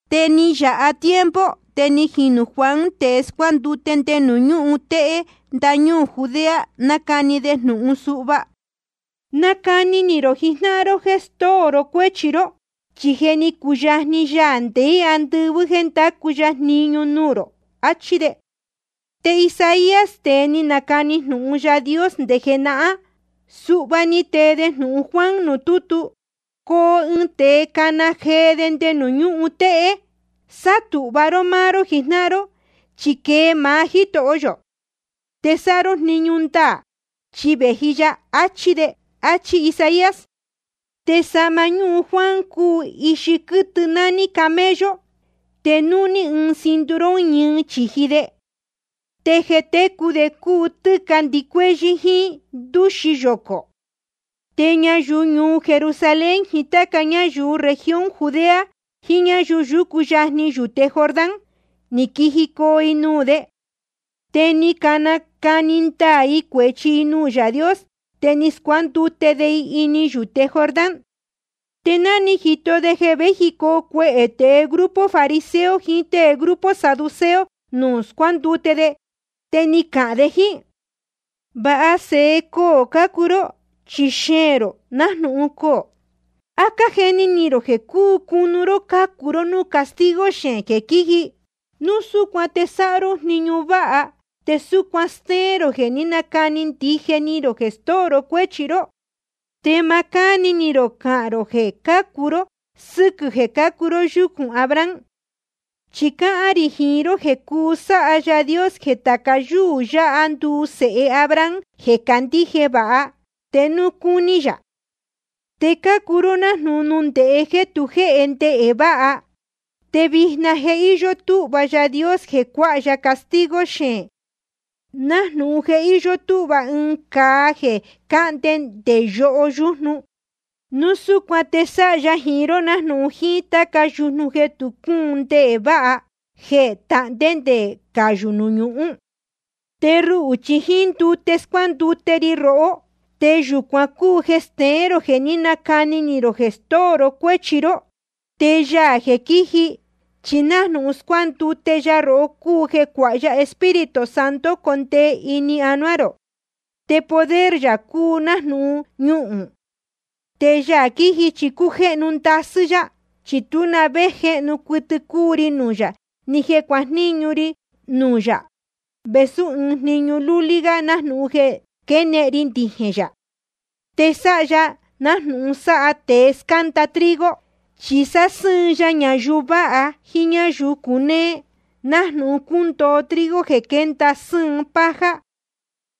Te ni yāha tiempo, te ni jinū Juan tēe scuándute nde nuū ñúhun téhé ndañúū Judea, nácani de jnūhun suhva: Nacani ni rō jijnáhan ró jéē stóo ró cuéchi ró, chi je ni cuyajni Yaā ndeé andɨvɨ́ jéē ndacu ya jniñu nuū rō. Achí de. Te Isaías, tēe ni nacani jnūhun Yaā Dios nde jenahán, suhva ni tee de jnūhun Juan nuū tútu: Coo ɨɨn tēe cana jee nde nuū ñúhun téhé: Sátūhva ró máá ró jijnáhan ró, chi quee maá Jítoho yō. Te sáha ró jniñu ndaā, chi vēji ya, achi de. Achí Isaías. Te sahma ñúhun Juan cúu ixi quɨtɨ nání camello, te núhní ɨɨn cinturón ñɨɨ chīji de. Te jeē técu de cúu tɨ́ca ndɨcuéhyɨ́ jíín ndúxi yocō. Te ñayuu ñuu Jerusalén jiín táca ñáyuu región Judea jiín ñáyuu yúcu yajni yuyúte Jordán, ni quijicoo i nuū de. Te ni canacani ndaā i cuēchi i nuū Yaā Dios, te ni scuándute de i ini yūte Jordán. Te ná ni jito de jeē véjicoo cuehē tēe grupo fariseo jiín tée grupo saduceo nuū scuándute de, te ni cahān de jíín: Va sēhe coō cácuu ró, chi xeēn rō nájnūhun coō. ¿A cájeni ni rō jeē cuu cunu ró cācu ró núū castigo xeēn jeē quíji? Núu súcuan te sáha ró jniñu váha, te súcuan stéén rō jeē ní canacani ndije ni rō jeē stóo ró cuéchi ró. Te ma cáni ni rō cahān rō jeē cuu cācu ró sɨ́quɨ̄ jeē cácuu ró yúcūn Abraham. Chi cáhán rī jiín ró jeē cuu sáha Yaā Dios jeē tāca yúū yáha nduu sēhe Abraham jeē candíje vāha, te núu cúní yā. Te cácuu ró nájnūhun nundēhé jeē tu jéhe ndehē váha. Te vijna je íyó túhva Yaā Dios jeē cuáha ya castigo xeēn, nájnūhun je íyó túhva ɨɨn cāa jeē cahnde nde yoho yujnu. Núu súcuan te sáha ya jiín ró nájnūhun jíín táca yujnu jeē tu cúun ndehē váha, jeē tahndé te cayū nuū ñuhún. Te ruhū chi jíín ndute scuándute ri rohó, te yūcuan cúu jeē steén rō jeē ní canacani ni rō jeē stóo ró cuéchi ró. Te Yaā jeē quíji, chi nájnūhun scuándute ya rohó cúu jeē cuáha ya Espíritu Santo condee ini anuá rō, te poder yā cúu nájnūhun ñuhūn. Te Yaā quiji chi cújéhnu ndasɨ́ yá. Chi tú na vé jéhnu cuɨtɨ cúu ri nuū yā, ni jeē cuajníñu ri nuū yā vēsú ɨɨn jniñu lúlí gá nájnūhun jeē quénehen ri ndijēn yā. Te sáha ya nájnūhun sáha tēe scánda trigo, chi sásɨ́ɨn ya ñayuu vāha jíín ñáyuu cunéé, nájnūhun cúndoo trigo jeē quénda sɨ́ɨn paja.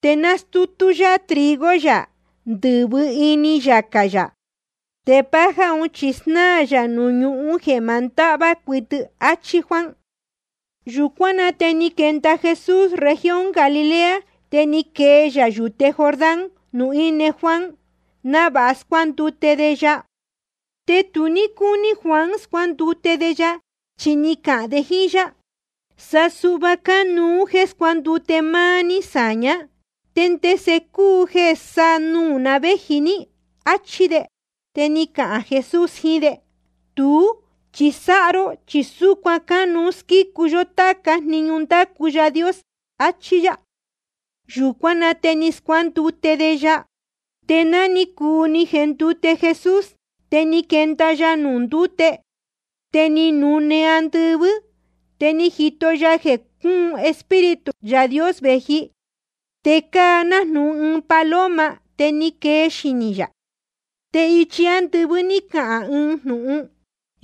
Te nastútú yá trigo yā ndɨ̄vɨ ini yacā yā. Te paja chi jnaa yā nuū ñuhún jeē ma ndahvá cuɨtɨ. Achí Juan. Yūcuán na te ni quenda Jesús región Galilea, te ni quee yā yūte Jordán nuū íne Juan, návāha scuándute de ya. Te tu ní cúní Juan scuándute de ya, chi ni cahān de jíín yá: Sa suhva cánuú jeē scuándute máá ní sāñá, ¿te ndese cúu jeē sa nuū ná vēji ní? áchí de. Te ni cahān Jesús jiín de: Tuú chi sáha ró, chi súcuan cánuú squícu yó táca jniñu ndácu Yaā Dios, achí yá. Yūcuán na te ni scuándute de ya. Te ná ni cuu ni jendute Jesús, te ni quenda ya nuū ndúte. Te ni nune‑ni andɨvɨ́, te ni jito ya jeē cúun Espíritu Yaā Dios vēji, te cáa nájnūhun ɨɨn paloma, te ni quee xinī yā. Te ichi ándɨvɨ́ ni cahān ɨɨn jnūhun: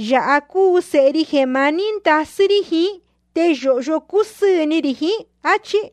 Yāha cúu Sēhe ri jeē maní ndasɨ́ rí jiín, te yōhyo cúsɨɨ̄ ni rī jiín, áchí.